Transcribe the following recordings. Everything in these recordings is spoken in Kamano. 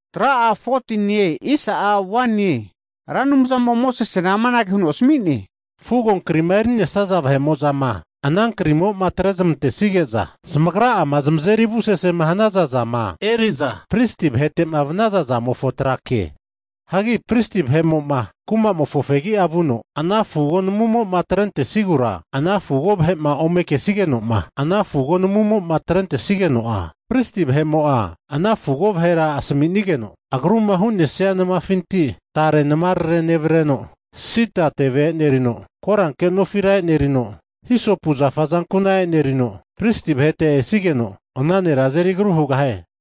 Ra Anumzamo'a Mosesena amanage huno asmi'ne, Fugonkrima eri'nesaza vahe'mo'zama ana krimo'ma atrezamantesige'za zamagra'ama zamazeri avusesema hanaza zama eri'za pristi vahete'ma vanaza zamofo trake. Hagi Pristi vahe'mo'ma kumamofo fegia vuno, ana fugo namumo'ma atrentesigura ana fugo vahe'ma ome kesigenoma, ana fugo namumo'ma atrentesigeno'a, pristi vahe'mo'a ana fugo vahera asamisigeno, agruma hu'nesia namafinti tare namarare nevreno, sida teve e'nerino, koranke nofira e'nerino, hisopu zafa azankuna e'nerino, pristi vahete esigeno ana nera azeri agru hugahie.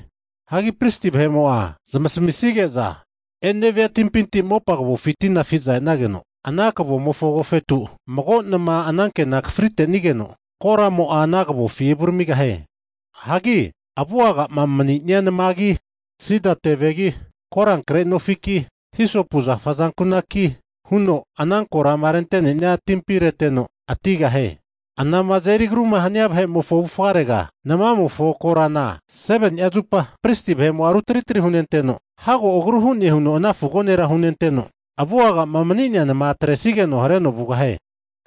Hagi pristi vahe'mo'a zamasamisige'za enevania timpinti mopa kavofi tina afi'za esageno, ana kavomofo agofeto mago nama anankena akafrinigeno, koramo'a ana kavofi evuramigahie. Hagi avu'agama mania namagi, sida tevegi, korankre nofiki, hisopu zafa azankunaki huno ana korama rente'nenia timpina reteno atigahie. Anama azeri agruma hania vahe'mofo avufarega namamofo korana 7ni'a zupa pristi vahe'mo'a rutri tri hunenteno, hago agru hane huno ana fugo nera hunenteno, avuga'ma mani'nea nama atresigeno hareno vugahie.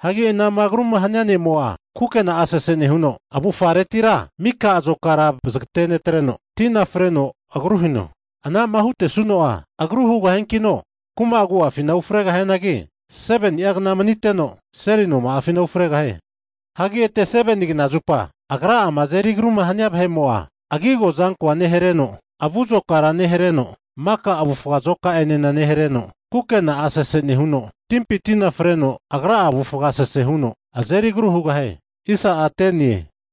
Hagi ana'ma agruma hania ne'mo'a, kukena'a sese nehuno avufaretira mika azokara vazagatenetreno, tina freno agrua hino. Ana'ma hutesuno'a, agru hugahiankino kuma agu'afina ufregahianagi, 7ni'a kna maniteno seli noma'afina ufregahie. Hagi ete 7ni kna zupa agra'ama azeri agruma hania vahe'mo'a agi azokora nehareno, avu azokara nehareno, maka avufga azoka'ene nehareno, kukena'a sese nehuno, timpi tina freno agra'a avufga sese huno azeri agru hugahie.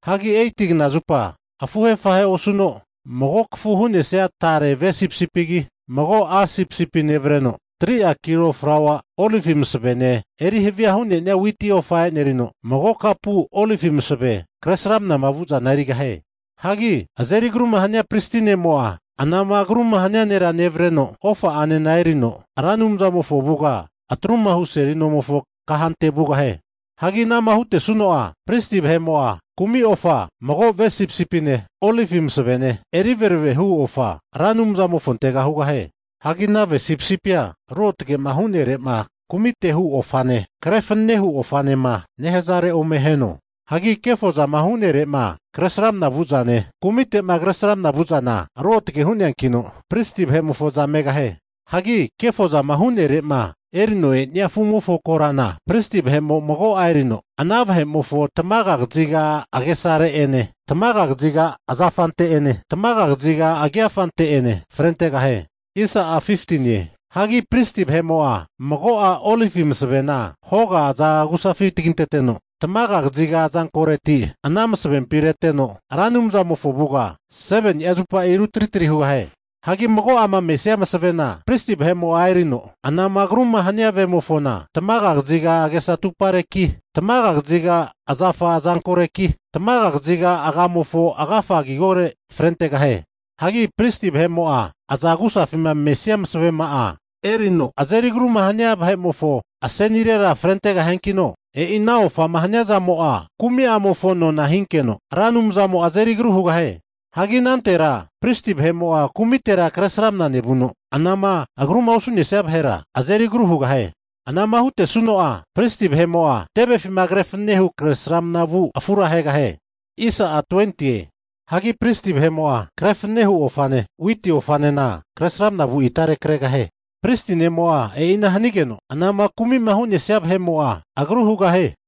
Hagi 8ti kna zupa afuhe afahe osuno mago kafu hu'nesia tare ve sipisipigi, mago a' sipisipi nevreno, 3'a kilo flaua olivi masavene eri havia hu'ne'nia witi ofa e'nerino, mago kapu olivi masave kre sramanama vu'zana erigahie. Hagi azeri agruma hania pristi ne'mo'a, anama agru'ma hania nera nevreno ofa'anena erino Ra Anumzamofo avuga atru'ma hu seli nomofo kahante vugahie. Hagi ana'ma hutesuno'a, pristi vahe'mo'a kumi ofa mago ve sipisipine, olivi masavene eri verave hu ofa Ra Anumzamofontega hugahie. Hagi ana ve sipisipia ruotage'ma hu'nere'ma kumite'ma hu ofane, kre fanane hu ofanema nehazare ome aheno. Hagi kefozama hu'nere'ma kresramana vu'zane kumite'ma kresramana vu'zana ruotage hu'neankino pristi vahe'mofoza megahie. Hagi kefozama hu'nere'ma erino e'nea sipisipi afu'mofo korana, pristi vahe'mo'a mago'a erino ana vahe'mofo tamaga kaziga agesare'ene, tamaga kaziga azafare'ene tamaga kaziga agigore'ene frentegahie. Hagi pristi vahe'mo'a mago'a olivi masavena hoga aza agu'safi taginteteno, tamaga kaziga azankoreti ana masavempi reteno, Ra Anumzamofo avuga 7ni'a zupa rutri trira hugahie. Hagi mago'ama mesia masavena pristi vahe'mo'a erino anama agruma hania vemofona, tamaga kaziga agesa atupareki, tamaga kaziga azafa azankoreki, tamaga kaziga agamofo agafa agigore frentegahie. Hagi pristi vahe'mo'a aza agu'safima mesia masavema'a erino azeri agruma hania vahe'mofo asenirera frentegahiankino, e'i ana ofama hania zamo'a kumi'amofo nona hinkeno, Ra Anumzamo'a azeri agru hugahie. Hagi anantera pristi vahe'mo'a kumitera kresramana nevuno, anama agruma osu'nesia vahera azeri agru hugahie. Ana'ma hutesuno'a, pristi vahe'mo'a tevefima kre fananehu kresramna vu sipisipi afura ahegahie. Hagi pristi vahe'mo'a kre fanane hu ofane, witi ofanena kresramna vu itare kregahie. Pristi ne'mo'a e'ina hanigeno, anama kumi'ma hu'nesia vahe'mo'a agru hugahie.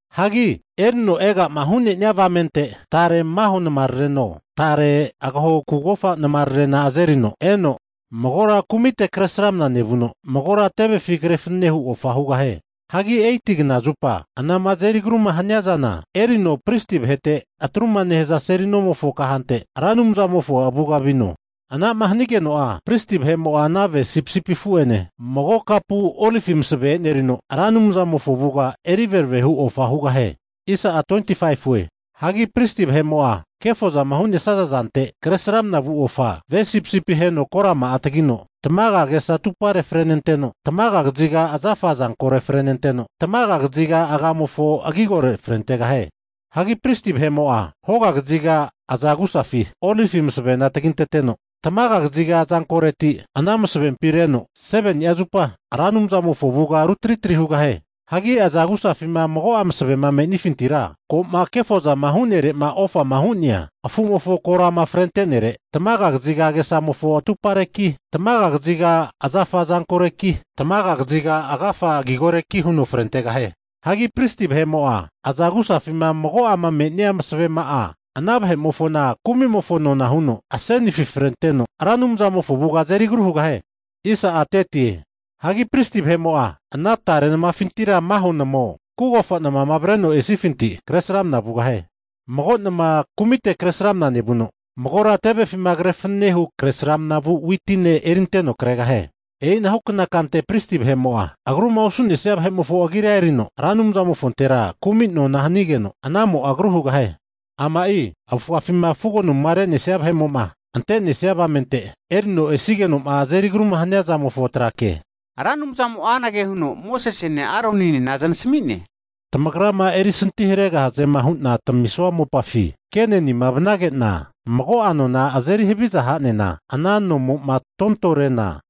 Hagi erino ega'ma hu'ne'nia avamente tare maho namarareno, tare agaho kugofa namararena azerino eno, magora kumite Kresramana nevuno, magora tevefi kre fanane hu ofa hugahie. Hagi 8ti knazupa anama azeri agruma haniazana erino pristi vahete atru'ma nehaza seli nomofo kahante Ra Anumzamofo avuga vino. Ana'ma hanigeno'a, pristi vahe'mo'a ana ve sipisipi afu'ene mago kapu olivi masave erino Ra Anumzamofo avuga eri veravehu ofa hugahie. Hagi pristi vahe'mo'a kefozama hu'naza zante kresramna vu ofa, ve sipisipi aheno korama'a tagino tamaga agesa atupare frenenteno, tamaga kaziga azafa azankore frenenteno, tamaga kaziga agamofo agigorera frentegahie. Hagi pristi vahe'mo'a hoga kaziga aza agusafi olivi masavena taginteteno, tamaga kaziga azankoreti ana masavempi areno 7ni'a zupa Ra Anumzamofo avuga rutri tri hugahie. Hagi aza agusafima mago'a masavema me'nefintira ko'ma kefozama hu'nere'ma ofama hu'nea afumofo korama frentenere, tamaga kaziga agesamofo atumpareki, tamaga kaziga azankoreki, tamaga kaziga agafa agigoreki, huno frentegahie. Hagi pristi vahe'mo'a aza agusafima mago'ama me'nia masavema'a ana vahe'mofona kumimofo nona huno asenifi frenteno Ra Anumzamofo avuga azeri agru hugahie. Hagi pristi vahe'mo'a ana tare namafinti'ma maho namao, kugofa namama avreno esifinti kresramna vugahie. Mago nama kumite kresramana nevuno, magora tevefima kre fananehu kresramna vu witine erinteno kregahie. E'inahukna kante pristi vahe'mo'a agru'ma osu'nesia vahe'mofo agira erino, Ra Anumzamofontera kumi nona hanigeno, anamo'a agru hugahie. Ama'i avufafima fugo namuma re'nesia vahe'mo'ma ante'nesia avamente erino esigeno'ma azeri agruma hania zamofo trake. Ra Anumzamo'a anage huno Mosesene Aroninena znasami'ne, Tamagrama erisanti haregahazema hu'na tamisua mopafi Kenenima vanage'na, mago'a nona azeri haviza hanena ana nomo'ma tontore'na,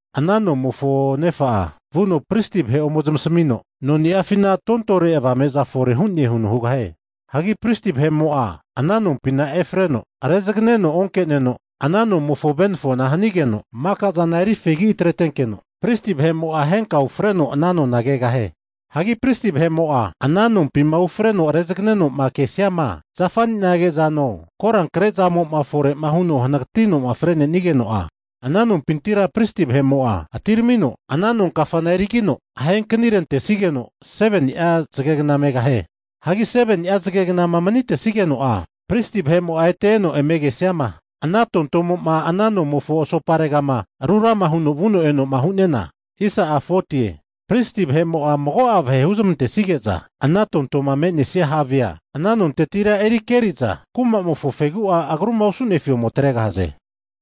ana nomofo nefa'a vuno pristi vahe ome zamasamino, noni'afina tontore avame'za fore hu'ne huno hugahie. Hagi pristi vahe'mo'a ana nompina efreno rezaganeno onke'neno, ana nomofo venafona hanigeno makazana eri fegi atretenkeno, pristi vahe'mo'a henka ufreno ana nona kegahie. Hagi pristi vahe'mo'a ana nompima ufreno rezageno'ma kesiama zafaninage zano, korankre zamo'ma fore'ma huno hanagatino fre'nesigeno'a, ana nompintira pristi vahe'mo'a atiramino ana nonkafana erigino, ahe kanirentesigeno 7ni'a zagegna megahie. Hagi 7ni'a zage gnama manitesigeno'a, pristi vahe'mo'a ete eno eme kesiama, ana tontomo'ma ana nomofo asoparegama rurama huno vuno eno'ma hu'nena, pristi vahe'mo'a mago'a vahe huzmantesige'za ana tontoma manesi'a havea ana nontetira eri keri'za kumamofo fegu'a agru'ma osu'nefi ome atregahaze.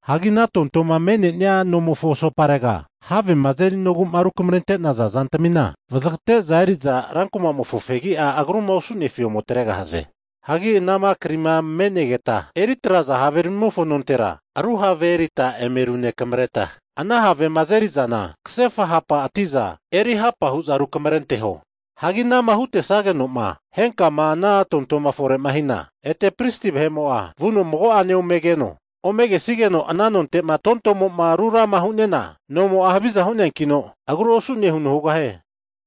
Hagi ana tontomo'ma me'nenia nomofo asoparega havema azerinogu'ma rukamarente'naza zantamina vazagate'za eri'za rankumofo fegi'a agruma osu'nefi ome atregahaze. Hagi anama krima me'negeta eritraza haveramimofo nontera, ru have eri'za eme runekamare'za, ana havema azeri'zana kasefa hapa ati'za erihapa hu'za rukamrenteho. Hagi anama hutesagenoma henkama ana tontoma fore'ma hina, ete pristi vahe'mo'a vuno mago'ane omegeno. Ome kesigeno ana nonte'ma tontomo'ma rurama hu'nena, nomo'a haviza hu'neankino agru osu'ne huno hugahie.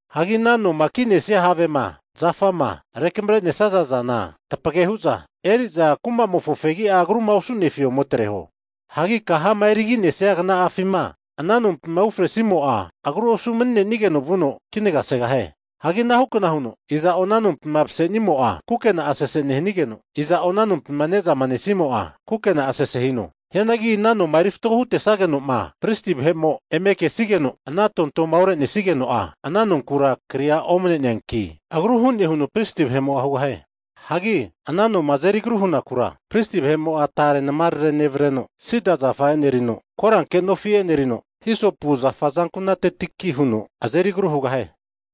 Hagi ana noma ki'nesia havema, zafama, rekamre'nesaza zana tapage hu'za eri'za kumamofo fegi'a agruma osu'nefi ome atreho. Hagi kahama eriginesia kna'afima ana nompima ufresimo'a, agru osu mani'nenigeno vuno kinaga segahie. Hagi anahunkna huno iza'o, ana nompima mase'nimo'a kukena'a sese nehanigeno, iza'o ana nompima ne'zama nesimo'a, kukena'a sese hino. Hianagi ana noma eri fatgo hutesageno'ma pristi vahe'mo eme kesigeno, ana tontoma orenenigeno'a ana nonkura kria omane'neanki, agru hu'ne huno pristi vahe'mo'a hugahie. Hagi ana noma azeri agruma hunakura, pristi vahe'mo'a tare namarare nevreno, sida zafa e'nerino, koranke nofi enerino, hisopu zafa azankunatetiki huno azeri agru hugahie.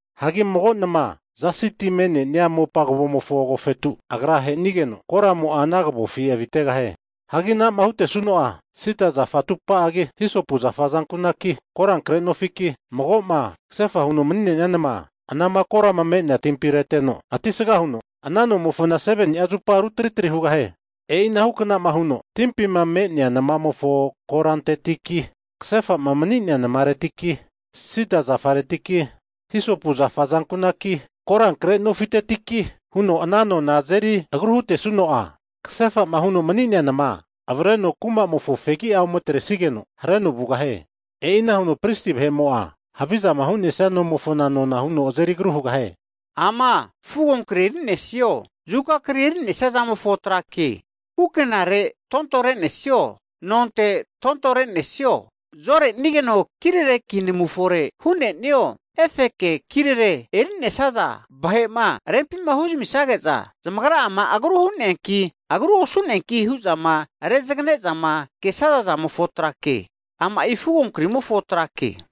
Hagi mago nama zasi ti me'nenia mopa kavomofo agofetu agra ahenigeno, koramo'a ana kavofi avitegahie. Hagi anama hutesuno'a, sida teve zafa atupa'agi, hisopu zafa azankunaki, korankre nofiki, mago'ma kasefa huno mani'nea nama anama korama me'nea timpi reteno atisga huno, ana nomofona 7ni'a zupa rutri tri hugahie. E'ina hukanama huno timpima me'nea namamofo korantetiki, kasefa'ma mani'nea namaretiki, sida zafaretiki, hisopu zafa azankunaki, korankre nofitetiki, huno ana noma azeri agru hutesuno'a, kasefa'ma huno mani'nea nama avreno kuma'mofo fegia ometresigeno hareno vugahie. E'ina huno pristi vahe'mo'a havizama hu'nesia nomofona nona huno azeri agru hugahie. Ama fugonkri eri'nesazo, zuka kri eri'nesaza zamofo tra ke, kukenare tontore'nesio, nonte tontore'nesio, zamavufagamo zorenegeno kirareki namu fore hu'nenio, efeke kirere eri'nesaza, vahe'ma rempima huzamisage'za zamagra'ama agru hu'neanki, agru osu'neanki hu'zama rezagnezama kesaza zamofo tra ke. Ama'i fugo krimofo tra ke.